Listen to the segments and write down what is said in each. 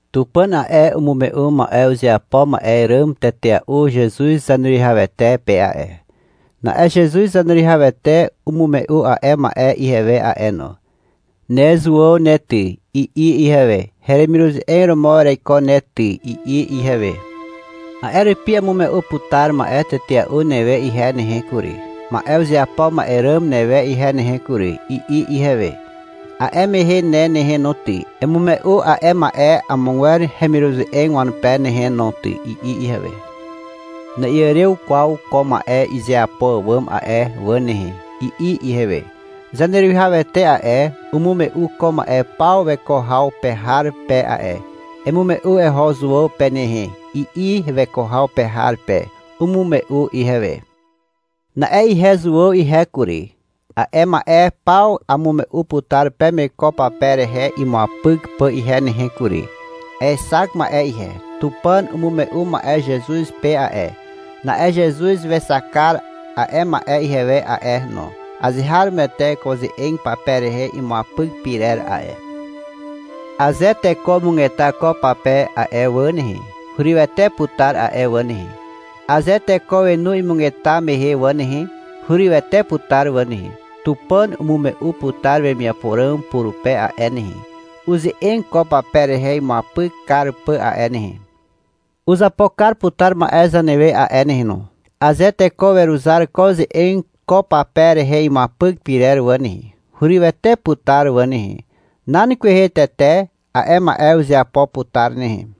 Tupàn a'e, umume'u ma'e uzeapo ma'e ràm tetea'u Zezuz Zaneruwihawete pe a'e. Na'e Zezuz Zaneruwihawete umume'u a'e ma'e ihewe a'e no. — Ne Zuàw ne ty, i'i ihewe. — Heremiruze'eg romo ereiko ne ty, i'i ihewe. — A'e rupi amume'u putar ma'e tetea'u newe ihe nehe kury, ma'e uzeapo ma'e ràm newe ihe nehe kury, i'i ihewe. — A'e mehe ne nehe no ty, emume'u a'e ma'e amogwer heremiruze'eg wanupe nehe no ty, i'i ihewe. — Na'iàrew kwaw ko ma'e izeapo àwàm a'e wà nehe, i'i ihewe. Zaneruwihawete a'e, umume'u ko ma'e paw weko haw pe har pe a'e. — Emume'u eho Zuàw pe nehe, i'i weko haw pe har pe. Umume'u ihewe. Na'e ihe Zuàw ihe kury, a'e ma'e paw amume'u putar peme ko pape rehe imuapyk pà ihe nehe kury. Aexak ma'e ihe. Tupàn umume'u ma'e Zezuz pe a'e. Na'e Zezuz wexak kar a'e ma'e ihewe a'e no. Azeharomoete ko ze'eg pape rehe imuapyk pyrer a'e. Aze teko umugeta ko pape a'e wà nehe, hurywete putar a'e wà nehe. Aze teko wenu imugeta mehe wà nehe, hurywete putar wà nehe. Tupàn umume'u putar wemiapo ràm purupe a'e nehe, uze'eg ko pape rehe imuapyk kar pà a'e nehe. Uzapo kar putar ma'e zanewe a'e nehe no. Aze teko weruzar ko ze'eg ko pape rehe imuapyk pyrer wà nehe, hurywete putar wà nehe. Nan kwehe tete a'e ma'e uzeapo putar nehe.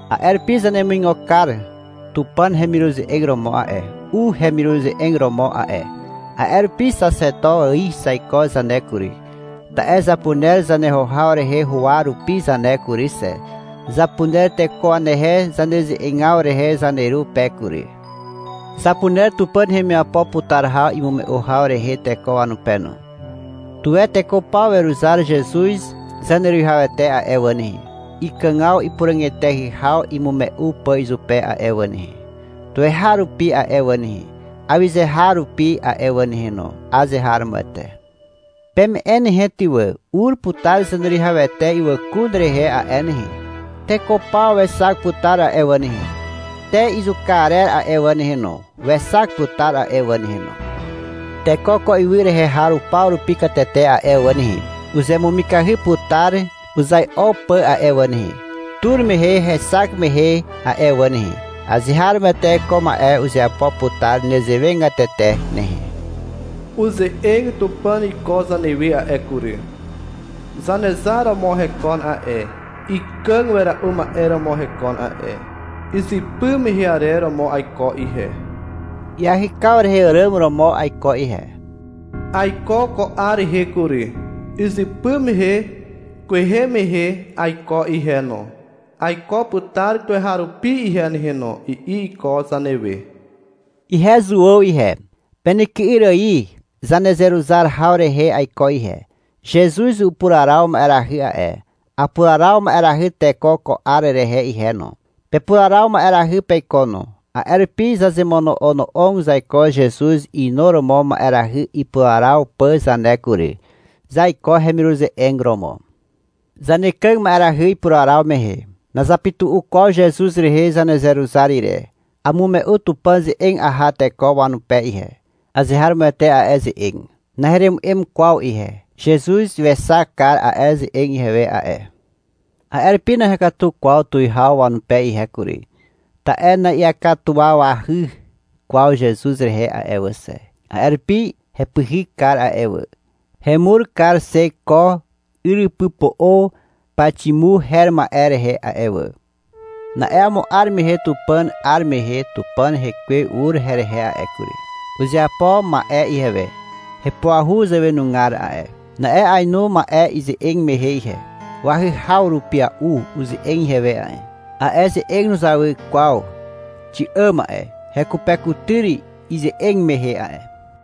A'e rupi zanemuigo kar Tupàn hemiruze'eg romo a'e, u hemiruze'eg romo a'e. A'e rupi Xaxeto ài zaiko zane kury, ta'e zapuner zaneho haw rehe huwa rupi zane kury xe. Zapuner teko wanehe zaneze'egaw rehe zaneru pe kury. Zapuner Tupàn hemiapo putar haw imume'u haw rehe teko wanupe no. Tuwe teko paw weruzar Zezuz Zaneruwihawete a'e wà nehe, ikàgaw ipuràg eteahy haw imume'u pà izupe a'e wà nehe, tuweharupi a'e wà nehe, awyze har rupi a'e wà nehe no. Azeharomoete. Peme'e nehe ty wà. Ur putar Zaneruwihawete ywàkun rehe a'e nehe. Teko paw wexak putar a'e wà nehe. Te izuka arer a'e wà nehe no, wexak putar a'e wà nehe no. Teko ko ywy rehe har paw rupi katete a'e wà nehe, uzemumikahy putar uzai'o pà a'e wà nehe, tur mehe hexak mehe a'e wà nehe. Azeharomoete ko ma'e uzeapo putar nezewegatete nehe. Uze'eg Tupàn iko zanewe a'e kury. Zanezar romo hekon a'e, ikàg wera'u ma'e romo hekon a'e. — Izypy mehe arer romo aiko ihe. Iahykaw rehe àràm romo aiko ihe. Aiko ko 'ar rehe kury. Izypy mehe kwehe mehe aiko ihe no, aiko putar tuweharupi ihe nehe no, i'i iko zanewe. Ihe Zuàw ihe, penyky'yr ài zanezeruzar haw rehe aiko ihe. Zezuz upuraraw ma'erahy a'e. Apuraraw ma'erahy teko ko 'ar rehe ihe no. Pepuraraw ma'erahy peiko no. A'e rupi zazemono'ono'og zaiko Zezuz inuromo ma'erahy ipuraraw pà zane kury. Zaiko hemiruze'eg romo. Zanekàg ma'erahy ipuraraw mehe. Nazapytu'u kwaw Zezuz rehe zanezeruzar ire. Amume'u Tupàn ze'eg aha teko wanupe ihe. Azeharomoete a'e ze'eg. Naheremu'em kwaw ihe. Zezuz wexak kar a'e ze'eg ihewe a'e. A'e rupi nahekatu kwaw tuwihaw wanupe ihe kury, ta'e na'iakatuwawahy kwaw Zezuz rehe a'e wà xe. A'e rupi hepyhyk kar a'e wà, hemur kar xe ko yrypypo'o Paximu her ma'e rehe a'e wà. Na'e amo 'ar mehe Tupàn 'ar mehe Tupàn Hekwe ur herehe a'e kury. Uzeapo ma'e ihewe hepuahu zàwenugar a'e. Na'e ainu ma'e ize'eg mehe ihe. Wahyhaw rupia'u uze'eg ihewe a'e. A'e ze'eg nuzawy kwaw xi'àm a'e. Hekupekutyr ize'eg mehe a'e.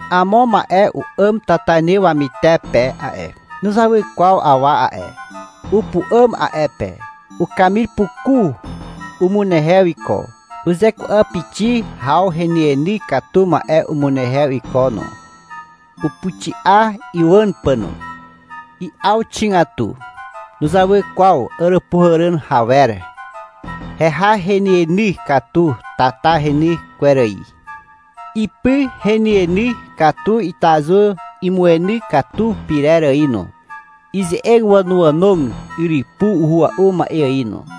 Amo ma'e u'àm tatainy wamytepe a'e. Nuzawy kwaw awa a'e. Upu'àm a'e pe. Ukamir puku umunehew iko. Uzeku'apixi haw henyeny katu ma'e umunehew iko no, upuxi'a iwàn pà no. I'aw xigatu. Nuzawy kwaw àràpuhàràn hawer. Heha henyeny katu tata reny kwer ài. Ipy henyeny katu itazu imueny katu pyrer ài no. Ize'eg wànoànog yrypu uhua'u ma'e ài no.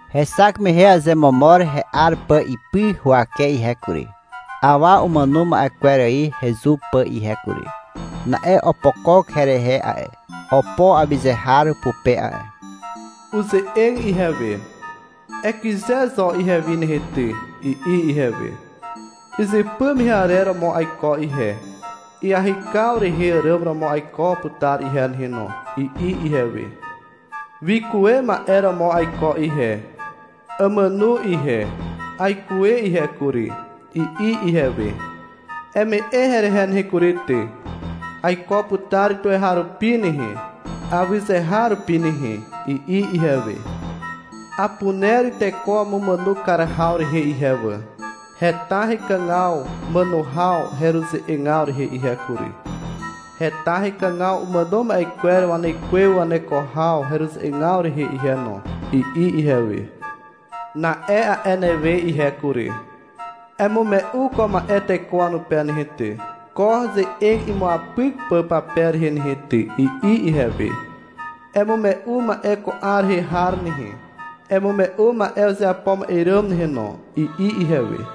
Hexak mehe azemomor he'ar pà ipy huwake ihe kury, awa umàno ma'e kwer ài hezu pà ihe kury. Na'e opokok herehe a'e, opo awyze har pupe a'e. Uze'eg ihewe. — Ekyze zo ihewi nehe ty, i'i ihewe. — Izypy mehe arer romo aiko ihe. Iahykaw rehe àràm romo aiko putar ihe nehe no, i'i ihewe. — Wikuwe ma'e romo aiko ihe. Amàno ihe, aikuwe ihe kury, i'i ihewe. — Eme'e herehe nehe kury ty, aiko putar tuweharupi nehe, awyze har rupi nehe, i'i ihewe. — Apuner teko wamumàno kar haw rehe ihe wà. Heta hekàgaw màno haw heruze'egaw rehe ihe kury. Heta hekàgaw umàno ma'e kwer wanekwe waneko haw heruze'egaw rehe ihe no, i'i ihewe. — Na'e a'e newe ihe kury, emume'u ko ma'e teko wanupe nehe ty, ko ze'eg imuapyk pà pape rehe nehe ty, i'i ihewe. — Emume'u ma'e ko 'ar rehe har nehe, emume'u ma'e uzeapo ma'e ràm nehe no, i'i ihewe.